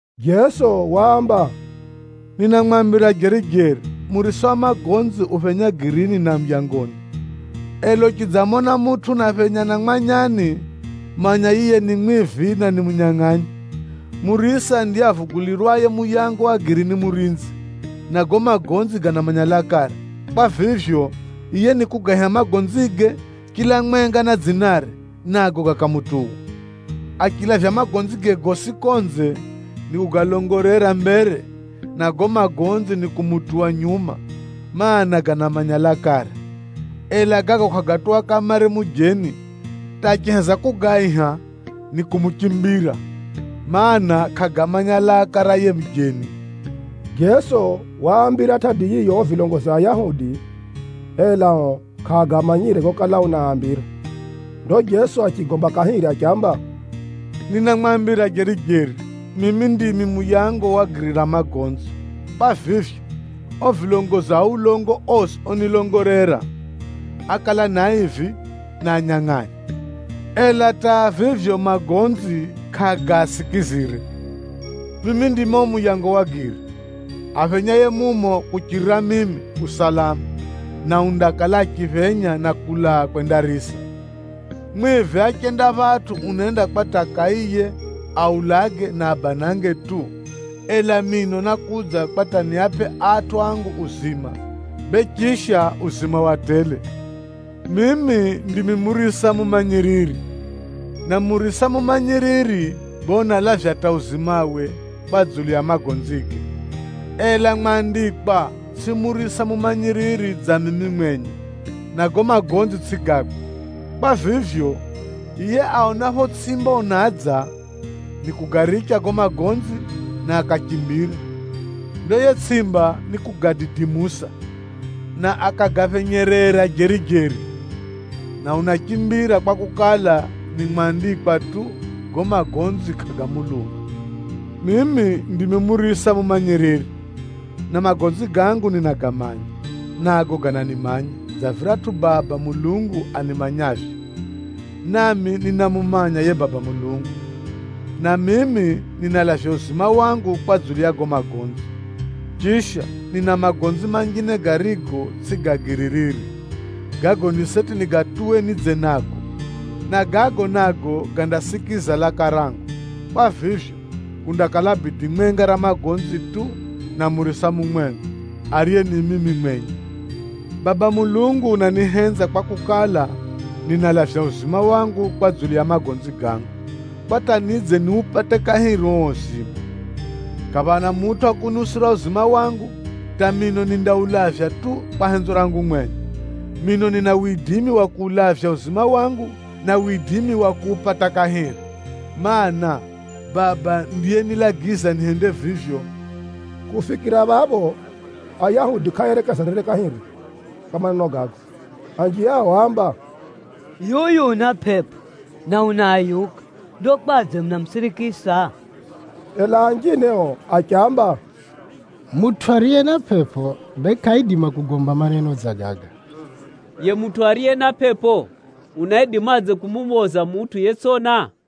Jeso waamba, “Ninamwambira jeri-jeri, murisa wa magonzi uphenya girini na muyangoni. Ela uchidzamona mutʼu unaphenya na mwanyani, manya yiye ni mwivi, na ni munyangʼanyi. Murisa ndiye avugulirwaye muyango wa giri ni murinzi, na gago magonzi ganamanya lakare. Kwa vivyo, yiye nikugaiha magonzige, chila mwenga na dzinare, nago gakamutuwa. Achilavya magonzige gosi konze, nikugalongolera mbere, na gago magonzi nikumutuwa nyuma, mana, ganamanya lakare. Ela gago kʼagatuwa kamare mujeni, hata achiheza kugaiha, nikumuchimbira, mana, kʼagamanya laka ra yiye mujeni.” Jeso waambira tʼadi yiyo o vilongozi a Ayahudi, ela o kʼaagamanyire gokala unaambira. Ndo Jeso achigomba kahiri achiamba, “Ninamwambira jeri-jeri, mimi ndimi muyango wa giri ra magonzi. Kwa vivyo, o vilongozi a ulongo osi onilongolera, ákala ni aivi na anyangʼanyi, ela hata vivyo magonzi kʼagaasikizire. Mimi ndimi o muyango wa giri. Aphenyaye mumo kuchirira mimi, u salama, na undakala achiphenya na kulaa kwendarisa. Mwivi achenda phatʼu unenda kwa hata akaiye, aulage, na abanange tu. Ela mino nákudza kwa hata niapʼe atʼu angu uzima, bee chisha uzima wa tele. “Mimi ndimi murisa mumanyiriri, na murisa mumanyiriri bee unalavya hata uzimawe kwa dzulu ya magonzige. Ela mwandikwa tsʼi murisa mumanyiriri dza mimi mwenye, na gago magonzi tsʼi gakwe. Kwa vivyo, yiye aonapho tsʼimba unadza, nikugaricha gago magonzi, na akachimbira. Ndo yiye tsʼimba nikugadidimusa, na akagaphenyerera jeri-jeri. Na unachimbira kwakukala, ni mwandikwa tu, gago magonzi kʼagamuluma. Mimi ndimi murisa mumanyiriri na magonzi gangu ninagamanya, nago gananimanya dza viratʼu Baba Mulungu animanyavyo, nami ninamumanya yiye Baba Mulungu. Na mimi ninalavya uzima wangu kwa dzulu ya gago magonzi. Chisha, nina magonzi manjine garigo, tsʼi ga giri riri. Gago ni seti nigatuwe nidze nago, na gago nago gandasikiza laka rangu. Kwa vivyo, kundakala bidi mwenga ra magonzi tu, na murisa mumwenga, ariye ni mimi mwenye. Baba Mulungu unanihenza kwakukala, ninalavya uzima wangu kwa dzulu ya magonzi gangu, kwa hata nidze niupate kahiri uo uzima. Kʼaphana mutʼu wa kuniusira uzima wangu, hata mino nindaulavya tu kwa henzo rangu mwenye. Mino nina widimi wa kuulavya uzima wangu, na widimi wa kuupata kahiri, mana, Baba ndiyenilagiza nihende vivyo.” Kufikira phapho, Ayahudi kʼaaerekezanire kahiri kwa maneno gago. Anji ao áamba, “Yuyu una pʼepʼo, na unaayuka. Ndo kwadze munamusirikisa?” Ela anjine o achiamba, “Mutʼu ariye na pʼepʼo, bee kʼaidima kugomba maneno dza gaga. Yiye mutʼu ariye na pʼepʼo unaidimadze kumuphoza mutʼu yetsʼona?”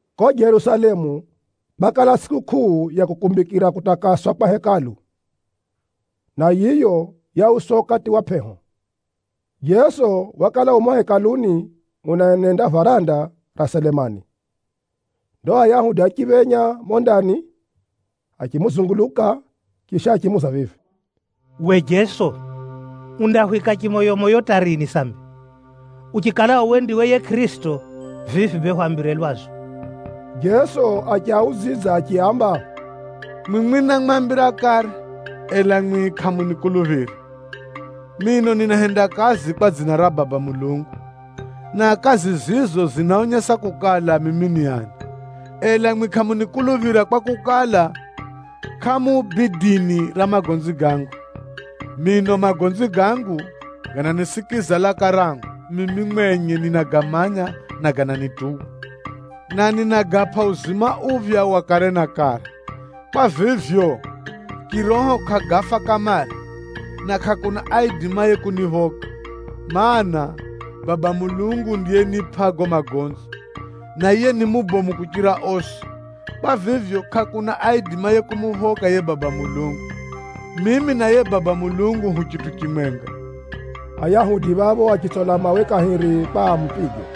Ko Jerusalemu, kwakala tsʼikukʼuu ya kukumbikira kutakaswa kwa Hekalu, na yiyo yauswa ukati wa pʼeho. Jeso wakala u mumo Hekaluni unaenenda varanda ra Selemani. Ndo Ayahudi achiphenya mumo ndani achimuzunguluka, chisha achimuuza vivi, “We Jeso, undahwika chimoyomoyo hata rini sambi? Uchikala uwe ndiwe yiye Kʼirisito, vivi bee hwambire lwazu.” Jeso achiaudzidza achiaamba, “Mwimwi námwambira kare, ela mwi kʼamunikuluphira. Mino ninahenda kazi kwa dzina ra Baba Mulungu, na kazi zizo zinaonyesa kukala mimi ni ani. Ela mwi kʼamunikuluphira kwakukala, kʼamu bidini ra magonzi gangu. Mino magonzi gangu ganasikiza laka rangu, mimi mwenye ninagamanya na gananituwa. Na ninagapʼa uzima uphya wa kare na kare. Kwa vivyo, chiroho kʼagafa kamare, na kʼakuna aidimaye kuniphoka. Maana, Baba Mulungu ndiyenipʼa gago magonzi, na yiye ni mubomu kuchira osi. Kwa vivyo, kʼakuna aidimaye kumuphoka yiye Baba Mulungu. Mimi na yiye Baba Mulungu hu chitʼu chimwenga.” Ayahudi phapho achitsola mawe kahiri kwa amupige.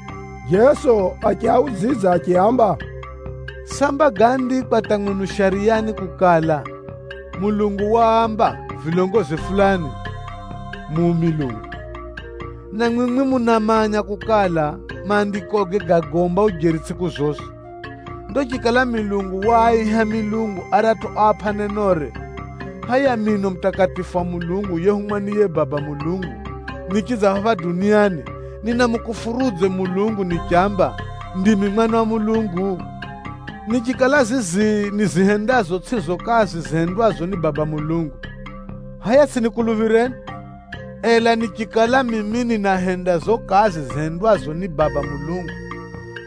Jeso achiaudzidza achiaamba, “Samba gáandikwa hata mwenu Shariyani kukala, Mulungu waamba vilongozi fulani, ‘Mu milungu.’ Na mwimwi munamanya kukala, Maandikoge gagomba ujeri tsʼiku zosi. Ndo chikala Mulungu waaiha milungu aratʼu oapʼa nenore, hʼaya, mino Mutakatifu wa Mulungu yehumwa ni yiye Baba Mulungu nichidza phapha duniani, ninamukufurudze Mulungu nichamba, ‘Ndimi Mwana wa Mulungu’? Nichikala zizi nizihendazo tsʼizo kazi zihendwazo ni Baba Mulungu, hʼaya tsʼinikuluphireni. Ela nichikala mimi ninahenda zo kazi zihendwazo ni Baba Mulungu,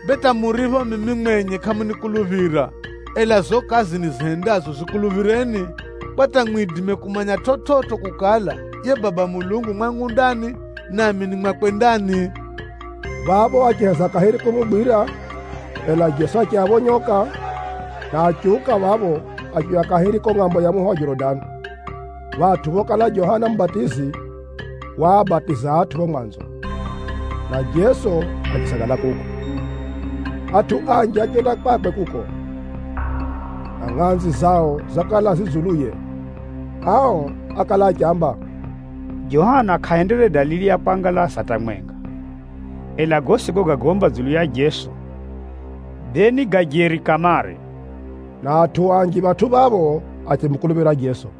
bee hata muripho mimi mwenye kʼamunikuluphira, ela zo kazi nizihendazo zikuluphireni, kwa hata mwidime kumanya chividzo kukala, yiye Baba Mulungu u mwangu ndani, nami ni mwakwe ndani.” Phapho achiheza kahiri kumugwira, ela Jeso achiaphonyoka, na achiuka phapho achiuya kahiri ko ngʼambo ya muho wa Jorodani, phatʼu phokala Johana Mubatizi waabatiza atʼu pho mwanzo, na Jeso achisagala kuko. Atʼu anji achenda kwakwe kuko, na ngʼanzi zao zakala zi dzuluye. Ao ákala achiamba, “Johana kʼahendere dalili ya kwangalaza hata mwenga. Ela gosi gogagomba dzulu ya Jeso, bee ni ga jeri kamare.” Na atʼu anji phatʼu phapho achimukuluphira Jeso.